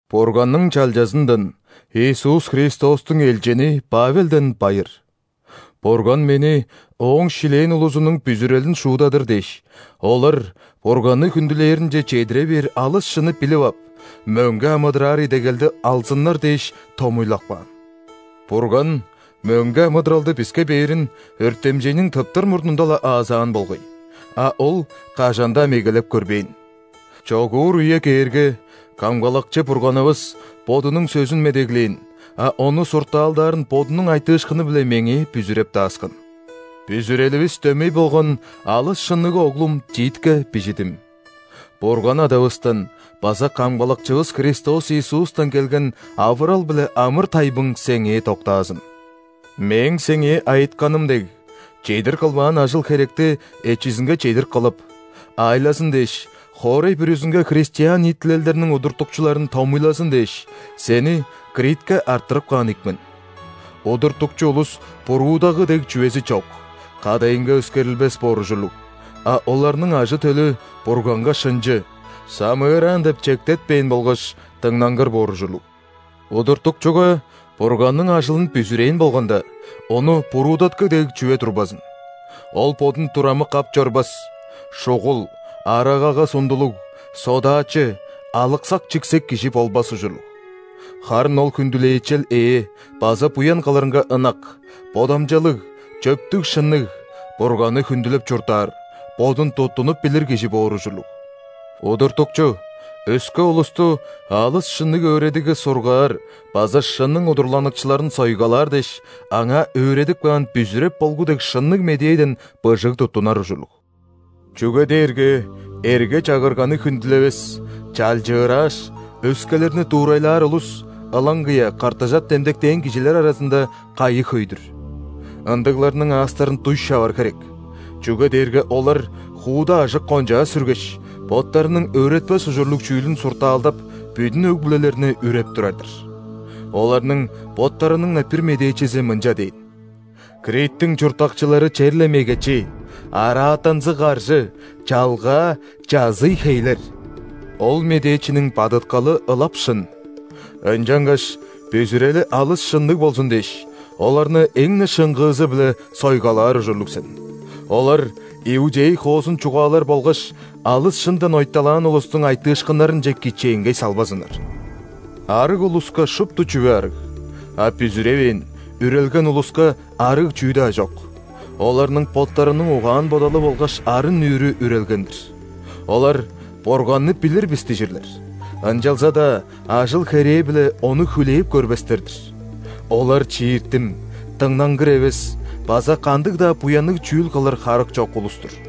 Бурганның чалчазындан, Иисус Христостуң элчини Павелден байыр. Бурган мени Ооң шилээн улузунуң бүзүрелин шуудадыр дээш, олар Бурганны хүндүлээринче чедире бээр алыс шынны билип ап, мөңге амыдыраар идегелди алзыннар дээш томуйлап каан. Бурган мөңге амыдыралды биске бээрин өртемчейниң тыптыр мурнунда-ла аазаан болгай, а Ол кажан-даа мегелеп көрбээн. Чогуур үе кээрге, Камгалакчы Бурганывыс Бодунуң сөзүн медеглээн, а ону суртаалдаарын Бодунуң айтыышкыны-биле меңээ бүзүреп дааскан. Бүзүреливис дөмей болган алыс шынныг оглум Титке бижидим. Бурган Адавыстан база Камгалакчывыс Христос Иисустан келген авырал биле амыр-тайбың сеңээ доктаазын! Мээң сеңээ айытканым дег, чедир кылбаан ажыл-херекти эчизинге чедир кылып, аайлазын дээш, хоорай бүрүзүнге христиан ниитилелдерниң удуртукчуларын томуйлазын дээш, сени Критке арттырып каан ийик мен. Удуртукчу улус буруудагы дег чүвези чок, кадайынга өскерилбес боор ужурлуг, а оларның ажы-төлү Бурганга шынчы, самыыраан деп чектетпээн болгаш дыңнангыр боор ужурлуг. Удуртукчуга Бурганның ажылын бүзүрээн болганда, ону буруудаткы дег чүве турбазын. Ол бодун турамык ап чорбас, шугул, арагага сундулуг, содаачы, алыксак-чиксек кижи болбас ужурлуг. Харын ол хүндүлээчел ээ база буян кылырынга ынак, бодамчалыг, чөптүг-шынныг, Бурганны хүндүлеп чурттаар, бодун туттунуп билир кижи боор ужурлуг. Удуртукчу өске улусту алыс шынныг өөредигге сургаар база шынның удурланыкчыларын сойгалаар дээш, аңаа өөредип каан бүзүреп болгу дег шынныг медээден быжыг туттунар ужурлуг. Чүге дээрге эрге-чагырганы хүндүлевес, чалчырааш, өскелерни дуурайлаар улус, ылаңгыя ·кыртыжап демдектээн кижилер аразында, кайы хөй-дүр. Ындыгларның аастарын дуй шавар херек, чүге дээрге олар хууда ажык-кончаа сүргеш, боттарының өөретпес ужурлуг чүүлүн суртаалдап, бүдүн өг-бүлелерни үреп турар-дыр. Оларның боттарының-на бир медээчизи мынча дээн: «Криттиң чурттакчылары черле мегечи, араатанзыг каржы, чалгаа, чазый хейлер!» Ол медээчиниң бадыткалы ылап шын. Ынчангаш бүзүрели алыс шынныг болзун дээш, оларны эң-не шыңгыызы-биле сойгалаар ужурлуг сен. Олар иудей хоозун чугаалар болгаш алыс шындан ойталаан улустуң айтыышкыннарынче кичээнгей салбазыннар. Арыг улуска шупту чүве арыг, а бүзүревээн, үрелген улуска арыг чүү-даа чок – оларның боттарының угаан-бодалы болгаш арын-нүүрү үрелген-дир. Олар: «Бурганны билир бис» – дижирлер, ынчалза-даа ажыл-херээ-биле Ону хүлээп көрбестер-дир. Олар чииртим, дыңнангыр эвес база кандыг-даа буянныг чүүл кылыр харык чок улус-тур.